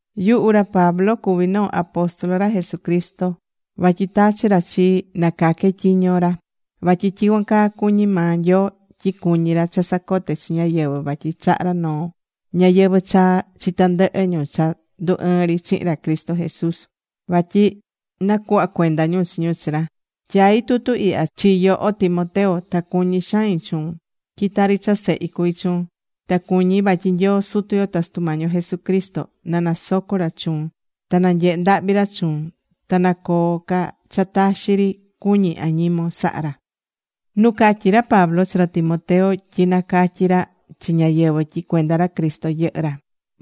Yuhu ra Pablo cuví noo apóstol ra Jesucristo vatyi tachi̱ ra chii na caque tyiño ra. Vatyi tyicuan caa cuñí maa Nyoo, tyi cuñí ra cha sacote chi ñáyɨvɨ vatyi chahá ra noo ñayɨvɨ̱ chaa chi tandɨhɨ ñu cha ndu ɨɨ̱n ri chihin ra Cristo Jesús vatyi nacuhva cuenda ñu chi ñu chi ra. Tyaí tutu ihya chi yoho Timoteo. Ta cuñí xain chuun tyi tari cha sehi cuví chuun. Ta cuñí vatyi Nyoo Sutu yo ta Sutu Mañi yo Jesucristo na nasoco ra chuun. Ta na nyehe ndahvi ra chuun. Ta na coo ca cha taxi ri cuñi añimon saha ra.Nu catyi̱ ra Pablo chi ra Timoteo tyi nacatyi ra chi ñáyɨvɨ tyi cuenda ra Cristo yɨhɨ́ ra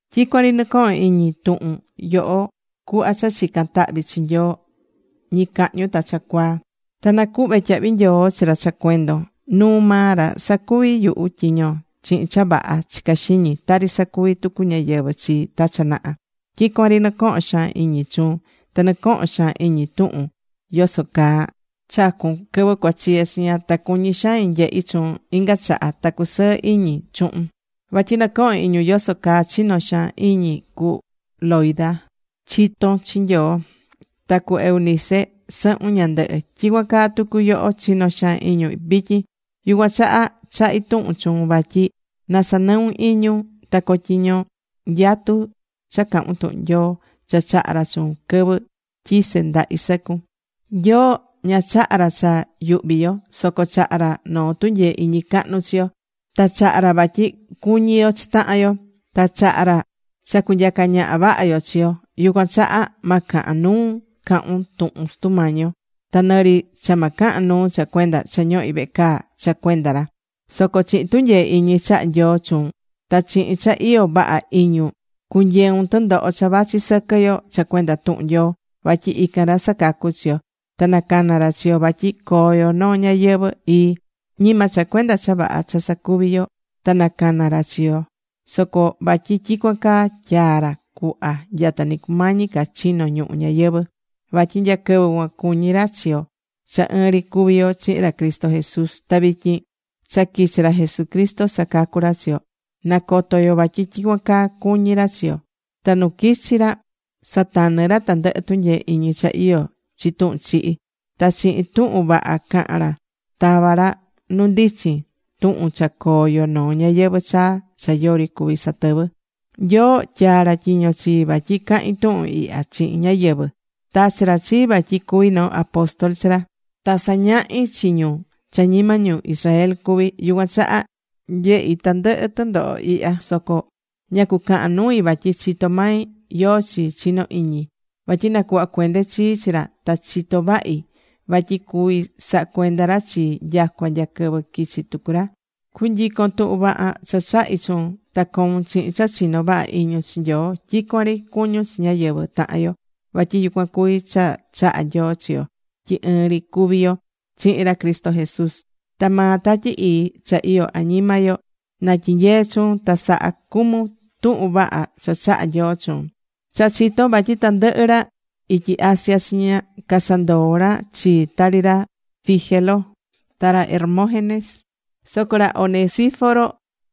Tyicuan ri nɨcohón iñi tuhun yoho cuhva cha chicán tahvi chi Nyoo ñicahñu ta cha cuaa. Ta nacuhvé tyahvi nyoo chi ra cha cuendon. Nuu maa ra sacuví yuhu tyiño chihin cha vaha chicá xiñi, tari sacuvi̱ tucu ñáyɨvɨ chii ta cha naha. Tyicuan ri nɨcohón xaan iñi chuun ta nɨcohón xaan iñi tuhun yoso caa chacu̱n quɨvɨ cuachiye chiña. Ta cuñí xain nyehi chuun inga chaha ta cusɨɨ iñi chuhun. Vatyi nɨcohón iñi yoso caa chino̱ xaan iñi cu Loida chiton chi Nyoo, ta cu Eunice sɨhun ñandɨhɨ. Tyicuan caa tucu yoho chinó xaan iñun vityin. Yucuan chaha chahí tuhun chuun vatyi na sanɨun iñun ta cotyiño nyatu cha cahun tuhun Nyoo cha chaha̱ ra chuun quɨvɨ tyisé ndahi sɨcun. Nyoo ña chaha̱ ra cha yuhvi yo. Soco chaha̱ ra noo tunyee iñi cahnu chi yo. Ta chaha̱ ra vatyi cuñí yo chi tahan yo. Ta chaha̱ ra cha cunyaca ñaha vaha yo chi yo. Yucuan chaha ma cahan nuun cahun tuhun Sutu Mañi yo. Ta nɨ ri cha ma cahan nuu cha cuenda cha ñohí vehe caa cha cuenda ra. Soco chihin tunyee iñi chaha̱ Nyoo chuun ta chihin cha iyó vaha iñun cu̱nyeun tɨndoho cha vachi sɨquɨ yo cha cuenda tuhun Nyoo. Vatyi ican ra sacacu̱ chi yo. Ta nacana ra chi yo vatyi coo yo noo ñayɨvɨ̱ ii. Ñima cha cuenda cha vaha cha sacuví yo ta nacana ra chi yo, soco vatyi tyicuan caa tyaa̱ ra cuhva nyata nɨ cumañi ca chino̱ ñuhu ñayɨvɨ̱. Vatyi nya quɨvɨ cuan cuñí ra chi yo cha ɨɨn ri cuví yo chihin, ra Cristo Jesús. Ta vityin cha quichi̱ ra Jesucristo sacacu̱ ra chi yo, nacoto̱ yo vatyi tyicuan caa cuñí ra chi yo. Ta nu quichi̱ ra, satanɨ̱ ra tandɨhɨ tunyee iñi cha iyó chi tuhun chihi. Ta chihin tuhun vaha caha̱n ra, tava̱ ra nu ndichin tuhun cha coo yo noo ñayɨvɨ̱ chaa cha yori cuví satɨvɨ. Nyoo tyaa̱ ra tyiño chii vatyi cahin tuhun ihya chihin ñáyɨvɨ. Tachi̱ ra chii vatyi cu̱vi noo apóstol chi ra, ta sañahí chi ñu cha ñima ñu Israel cuví. Yucuan chaha nyehí tandɨhɨ tɨndoho ihya. Soco ña cucahán nui vatyi chitó mai yóó chi chinó iñi. Vatyi nacuhva̱ cuende chii chi ra, ta chitó vahi vatyi cuví saha cuenda ra chii nyacua nya quɨvɨ quichi tucu ra. Cu̱nyicon tuhun vaha cha chahi̱ chuun. Ta co̱un chihin cha chinó vaha iñun chi Nyoo. Tyicuan ri cu̱ñun chi ñáyɨvɨ tahan yo. Vatyi yucuan cuví cha chahá Nyoo chi yo tyi ɨɨn ri cuví yo chihin ra Cristo Jesús. Ta maa Tatyi Ii cha iyó añima yo na tyinyee chuun ta sa̱ha cumun tuhun vaha cha chaha̱ Nyoo chuun. Cha chitón vatyi tandɨhɨ ra ityi Asia chiña casandoo̱ ra chii, tari ra Fígelo ta ra Hermógenes. Soco ra Onesíforo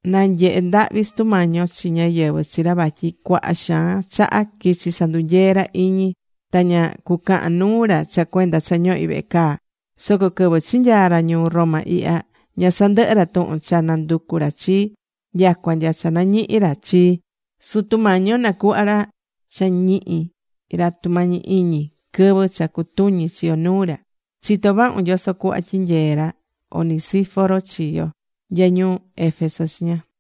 na nyehe ndahvi Sutu Mañi yo chi ñáyɨvɨ chi ra vatyi cuaha xaan chaha quichi̱ sandunyee ra iñi. Ta ña cucahan nuu ra cha cuenda cha ñohí vehe caa. Soco quɨvɨ chinyaa̱ ra ñuu Roma ihya, ña sandɨhɨ̱ ra tuhun cha nanducu ra chii nyacua nya cha nañihi̱ ra chii. Sutu Mañi yo nacuhva ra cha ñihi ra tumañi iñi quɨvɨ cha cutuñi chi yo nuu ra. Chitó vahun yoso cuhva tyinyee̱ ra Onesíforo chi yo nya ñuu Éfeso chiña.